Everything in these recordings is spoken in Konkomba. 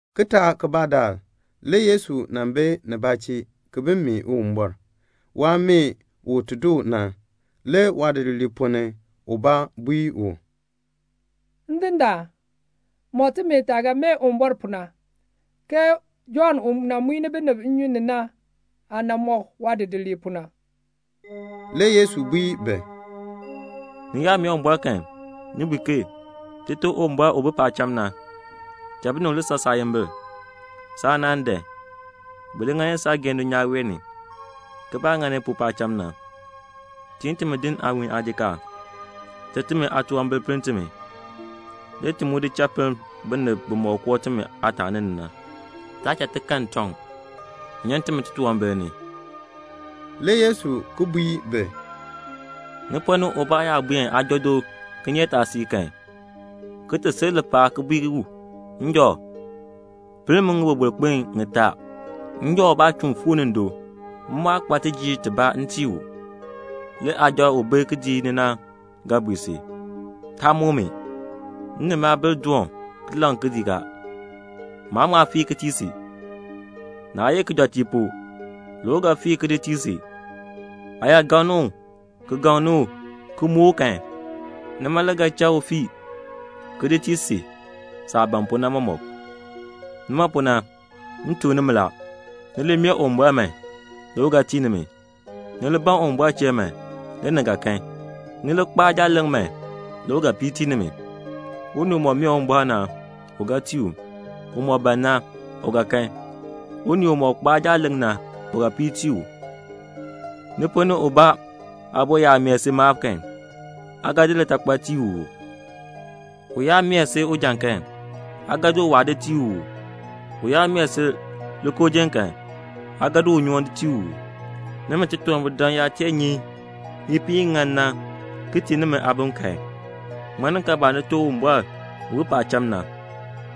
Kitaak kibaa daal le Yesu nan bi nibaa chee ki bi mee Uwumbɔr. Waah mee u ti doo na, le waadidiliib ponn ni ubaa bui u, "Ndindaan, mɔk timi taah ga mee Uwumbɔr pu na, ke Jɔnn u nan muin binib nnyun ni na aah mɔk waadidiliib pu na." Le Yesu bui bi, "Ni yaa mee Uwumbɔr kan, ni bui ke 'Tite Uwumbɔr u bi paacham na, binib n san saayimbil; saanaan n dan. Bi li ŋani saageehn dulnyaa wee ni, ke baah ŋani pu paacham na. Tiin timi din aawiin aajikaar. Cha timi aatunwambir pinn timi; le ti mu di cha pinn binib bimɔk koo timi aataani ni na. Taa cha ti kan ntɔŋ. Nyan timi titunwambir ni."' Le Yesu ki bui bi, "Ni ponn ni ubaa yaa buen aajɔ do kinyeetaasiik kan, ki ti sil lipaal ki bui u, 'Njɔ, pinn mi ŋiboroboro kpin ŋitaa; njɔ ubaa chuun fuu ni ndo; m mu aa kpa tijiir tibaa m tii u.' Le aajɔ u bi kidiik ni na ga bui si, 'Taa muk mi. M ni maabilb dɔ kidiik ni la. Ki laŋ a. Maan ŋma fii ki tii si.' Naa ye kijɔteek pu, le u ga fii ki di tii si. Aa yaa gaŋni u ki gaŋni u ki muk u kan, nima le ga cha u fii ki di tii si saah ban pu na mɔmɔk. Nima pu na m tuk nimi la, ni li mee Uwumbɔr man, le u ga tii nimi. Ni li ban Uwumbɔr chee man, le ni ga kan. Ni li kpaa jaaleŋ man, le u ga piir tii nimi. Unii umɔk mee Uwumbɔr na, u ga tii u. Umɔk ban na, u ga kan. Unii umɔk kpaa jaaleŋ na, u ga piir tii u. Ni ponn ni ubaa aabo yaa mee si maab kan, aa ga di litakpal tii u uu? U yaa mee si ujan kan, aa ga di uwaa di tii u uu? U yaa mee si likoojiln kan, aa ga di unyoohn tii u uu? Nimi titunwambirdam yaa tee nyi ipiin i ŋan na ki tii nimi aabim kan, ŋmaninkaabaa Nite Uwumbɔr u bi paacham na,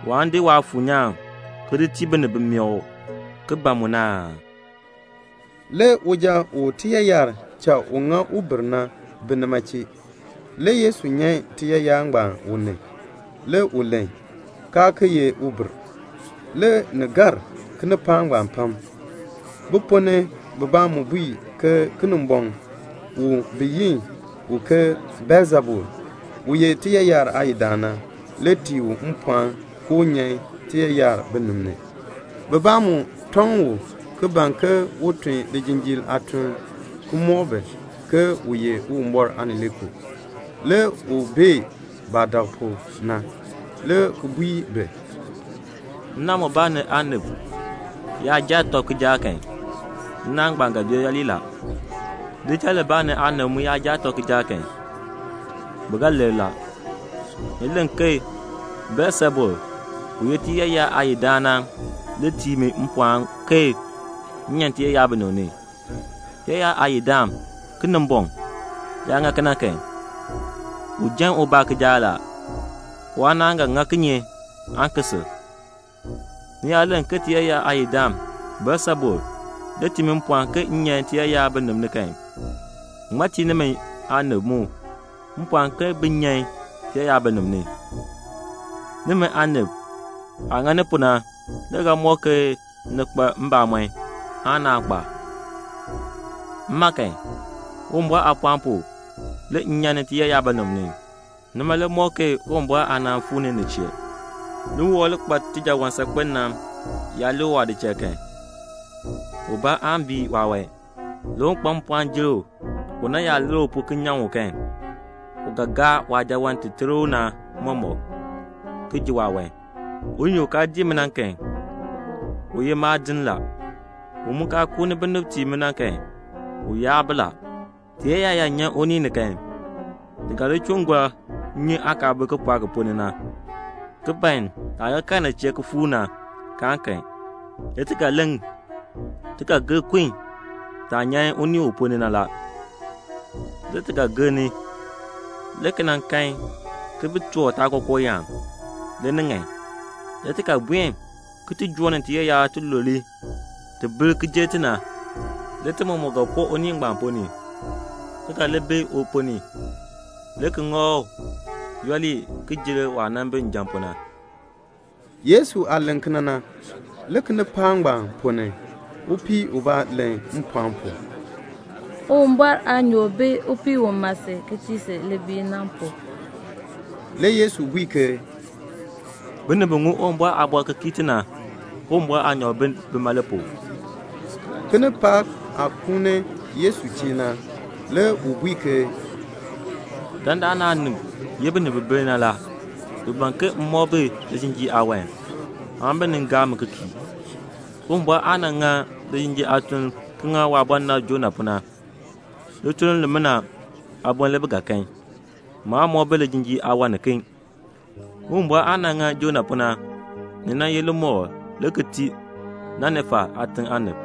waan di Waafuur nyaan ki di tii binib bi mee u ki ban mu na aa?" Le uja u tiyaayar cha u ŋa ubir na bi nima chee. Le Yesu nyan tiyaayar ngbaan u ni. Le u len, kaa ki ye ubir. Le ni gar kinipaak ngbaan pam. Bi ponn ni bibaa mu bui ke Kinimbɔŋ bi yi u ke Beelsebul, u ye tiyaayar aayidaan na, le tii u mpɔɔn ke un ti nyan tiyaayar binib ni. Bibaa mu tɔŋ u ki ban ke un tun lijinjiir aatuln ki mɔk bi ke u ye Uwumbɔr Aanileekoo. Le u bee baah dak pu na, le ki bui bi, "Nnaan mubaa ni aanib yaa jaa tɔb kijaak kan, nnaan ngbaan ga bee yooli la. Lidichal libaa ni aanib mu yaa jaa tɔb kijaak kan, bi ga lir la. Ni len ke Beelsebul u ye tiyaayar aayidaan na le tii mi mpɔɔn ke m nyan tiyaayar binib ni. Tiyaayar aayidaan Kinimbɔŋ yaa ŋa kena kan, u jan ubaa kijaak la. Waanaan ga ŋa kinye aan ki sil? Ni yaa len ke tiyaayar aayidaan Beelsebul le tii mi mpɔɔn ke m nyan tiyaayar binib ni kan, ke ŋmaa tii nimi aanib mu mpɔɔn ke bin nyan tiyaayar binib ni? Nimi aanib aah ŋani pu na le ga mɔk ke ni kpa mbamɔn aan naa kpa. Mma kan, Uwumbɔr aapɔɔn pu le m nyan ni tiyaayar binib ni. Nima le mɔk ke Uwumbɔr aanaan fuu ni ni chee. "Liwɔkl u kpa tijaawan saakpen na yaa lik waadichal kan, ubaa aan bii waawan. Le un kpa mpɔɔn jer u na yaa lir u pu ki nyaŋ u kan, u ga fii waajaawan ti ter u na mɔmɔk, ki ji waawan. "Unii u kaa dii mi na kan, u ye maadin la. U mu kaa kuuni binib tii mi na kan, u yaar bi la." "Tiyaayar yaa nyan unii ni kan, ti ga li chuun gɔr nnyun aah kaa bi kipɔɔk ki ponn ni na, ki ban taah ga kal nin chee ki fuur na, kaan kan. Le ti ga len, 'Ti ga gir kun taah nyan unii u ponn ni na la.' Le ti ga gir ni, le ki nan kan ke bi toor taakookooyaan, le ni ŋan. Le ti ga buen ki joo ni tiyaayar tilule ti bir ki jer ti na. Le ti mɔmɔk ga koo unii ngbaan ponn ni, ki ga li bi u ponn ni, le ki ŋa u yooli ki jer waah nan bi njan na pu na." Yesu aah len kena na, le kinipaak ngbaan ponn ni upii ubaa len mpɔɔn pu, "Uwumbɔr aanyoor bi upii u ma si ki tii si libiil na pu." Le Yesu bui ke "Binib bi ŋun Uwumbɔr aaliin ki kii i na, Uwumbɔr aanyoor bi bima le pu." Kinipaak aah kuuni Yesu chee na le u bui ke, "Dandana aanib ye binib bi bir na la. Bi ban ke m mɔk bi lijinjiir aawan, aan bi nin gaa mi ki kii. Uwumbɔr aah nan ŋa lijinjiir aatuln ki ŋa waabɔnabr Jonah pu na, lituln limina aaboln le bi ga kan. Maan mɔk bi lijinjiir aawan niken. Uwumbɔr aah nan ŋa Jonah pu na, ni nan ye limɔkl le ki tii Ninefa aatiŋ aanib.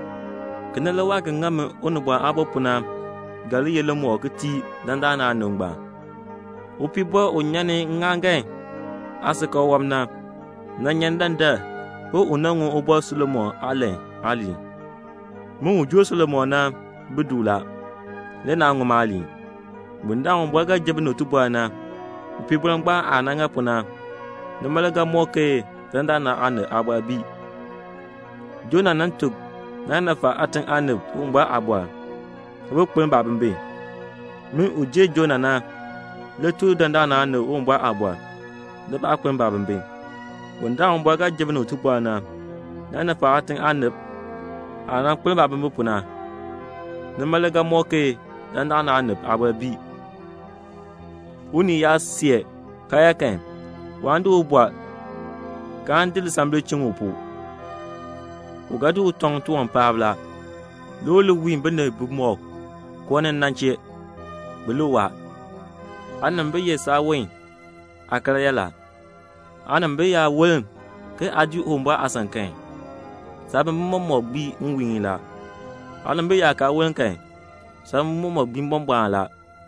Kena, waah ga ŋa min Unibɔn Aabo pu na, ni ga li ye limɔkl le ki tii dandana aanib ngbaan. Upiibɔr u nyan ni ŋŋaaŋgan aasikakl wɔb na, nan nyan ni dandar ke u nan ŋun Ubɔr Solomon aalan aaliin. Min u jer Solomon na bi du la, le naa ŋun maaliin. Bundaln Uwumbɔr ga ji binib tibɔr na, upiibɔr ngbaan aah nan ŋa pu na, nima le ga mɔk ke dandana aanib aabɔr bii. Jonah nan tuk Ninefa aatiŋ aanib Uwumbɔr aaliin, le bi kpeln baabimbin. Min, u jer Jonah na, le tuk dandana aanib Uwumbɔr aaliin, le baa kpeln baabimbin. Bundaln Uwumbɔr ga ji binib tibɔr na, Ninefa aatiŋ aanib aah nan kpeln baabimbin pu na, nima le ga mɔk ke dandana aanib aabɔr bii." "Unii yaa see karyaa kan, waan di u di bɔr, kaan di lisambil di chiŋ u pu. U ga di u tɔŋ tiwan paab la, le u li wiin binib bimɔk koo ni na, bi li waa. Aanimbil ye saawon aakaryaa la. Aanimbil yaa woln ke aa dii Uwumbɔr aasan kan, saabimbin mɔmɔk gbii nwiihn la. Aanimbil yaa kaa woln kan, saabimbin gbii mbɔmbɔɔn la.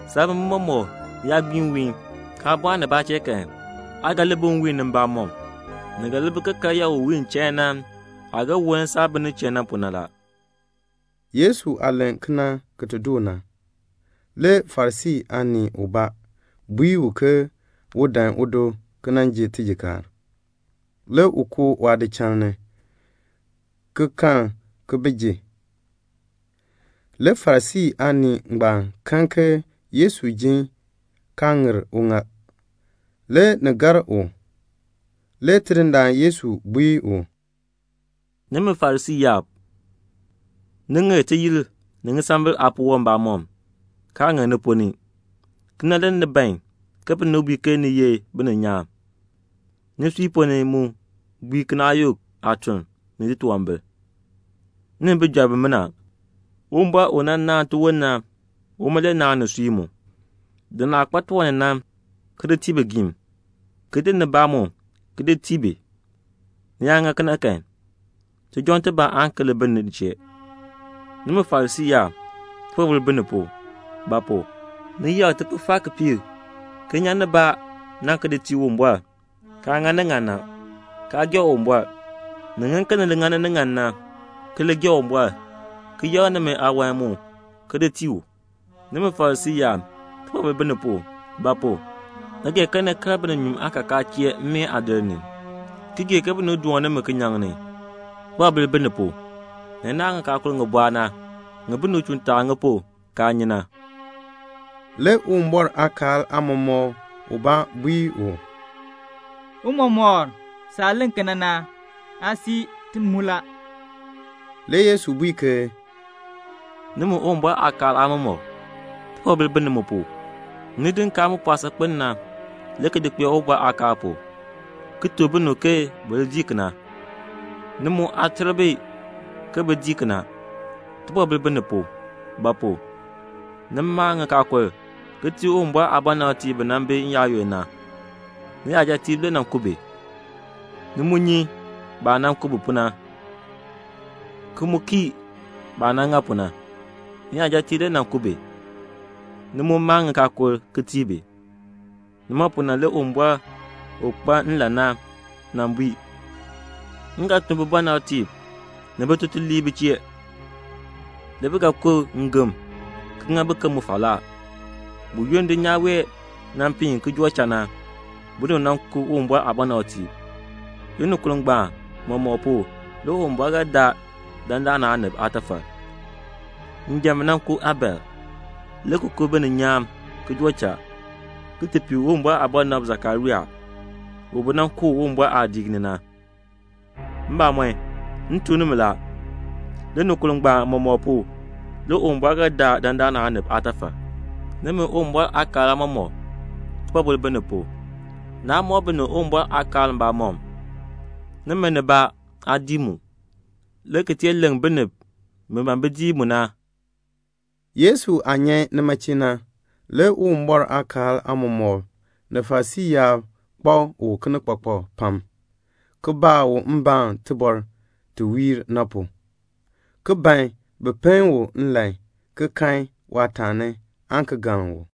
Saabimbin mɔmɔk yaa gbii nwiihn, kaa bɔɔn nibaa chee kan, aa ga li bi nwiihn ni mbamɔm. Ni ga li bi ke karyaa u wiin chain na bi, ki woln saah bi nin chee na." Le Yesu aah len kena ki ti doo na, le Farisii aanii ubaa bui u ke un dan udo ki nan ji tijikaar. Le u koo waadichal ni, ki kal ki ji. Le Farisii aanii ngbaan kan ke Yesu ji kaa ŋir uŋaal. Le ni gar u. Le Tidindaan Yesu bui u, "Nimi Farisii yaab, ni ŋir tiyir ni ŋisambil aapuwɔb mbamɔm, kaa ŋir ni ponn ni. Kena le ni ban ke binib bui ke ni ye bininyaan; nisui ponn ni mu gbiin kinaayuk aatuln ni titunwambir. Nimi bijɔrb, Uwumbɔr u nan naan tiwon na, uma le naan nisui mu. Di naah kpa tiwan ni na, ki di tii bigiim, ki di nibaa mu ki di tii bi. Ni yaa ŋa kena kan, tijɔŋ tibaa aan ki li bi ni chee. "Nimi Farisii yaab, tibɔbil bi ni pu; ba pu? ni yakr tikpifar kipiik ki nyan nibaa na ki di tii Uwumbɔr, kaa ŋani ni ŋan na, kaa gee Uwumbɔr. Ni ŋan ke ni li ŋani ni ŋan na, ki li gee Uwumbɔr, ki yakr nimi aawan mu ki di tii u. "Nimi Farisii yaab, tibɔbil bi ni pu; ba pu? ni gee ke ni kal bininyuun aakakaa chee mmeen aadir ni, ki gee ke binib doon nimi kinyaŋ ni. Tibɔbil bi ni pu. Ni naahn ŋikaakul ŋi bɔɔ na, ŋi binib chuun taar ŋi pu, kaa nyi na." Le Uwumbɔr aakaal aamɔmɔkr ubaa bui u, "Tiicha, saah len kena na, aa sii ti mu la." Le Yesu bui ke "Nimi Uwumbɔr aakaal aamɔmɔkb, tibɔbil bi ni mu pu. Ni di nkaal mu pɔɔ saakpen na, le ki di kpee Uwumbɔr aakaal pu, ki tuk binib ke bi li dii kena. Ni mu aa ter bi bin dii. Tibɔbil bi ni pu; ba pu? ni maa ŋikaakul ki tii Uwumbɔr aabɔnabtiib bi nan bi n-yaayoonn na. Niyajatiib le nan ku bi. Ni mu nyi baah nan ku bi pu na, ki mu kii baah nan ŋa pu na. Niyajatiib le nan ku bi. Ni mu maa ŋikaakul ki tii bi. Nima pu na le Uwumbɔr u kpa nlan na, nan bui, 'M ga tun bibɔnabtiib ni bitutuliib bi chee. Le bi ga ku ngem ki ŋa biken mu falaa.' Buyoonn dulnyaa wee nan piin ki joo cha na, binib nan ku Uwumbɔr aabɔnabtiib. Linikur ngbaan mɔmɔk pu le Uwumbɔr ga daa dandana aanib aatafal. Njan bi nan ku Abel, le ki ku bininyaan ki joo cha, ki ti pii Uwumbɔr aabɔnabr Sakaria, u bi nan ku u Uwumbɔr aadiik ni na. Mbamɔn, m tuk nimi la, linikur ngbaan mɔmɔk pu le Uwumbɔr ga daa dandana aanib aatafal. "Nimi Uwumbɔr aakaal aamɔmɔkb, tibɔbil bi ni pu. Naa mɔk binib Uwumbɔr aakaal mbamɔm. Nimi nibaa aa dii mu, le ki tee leŋ binib bi ban bin dii mu na." Yesu aah nyan nima chee na, le Uwumbɔr aakaal aamɔmɔkb, ni Farisii yaab kpak u kinikpakpak pam, ki baa u mbaan tibɔr ti wiir na pu, ki ban bin pen u nlan, bin ti kan waataani aan ki galn u.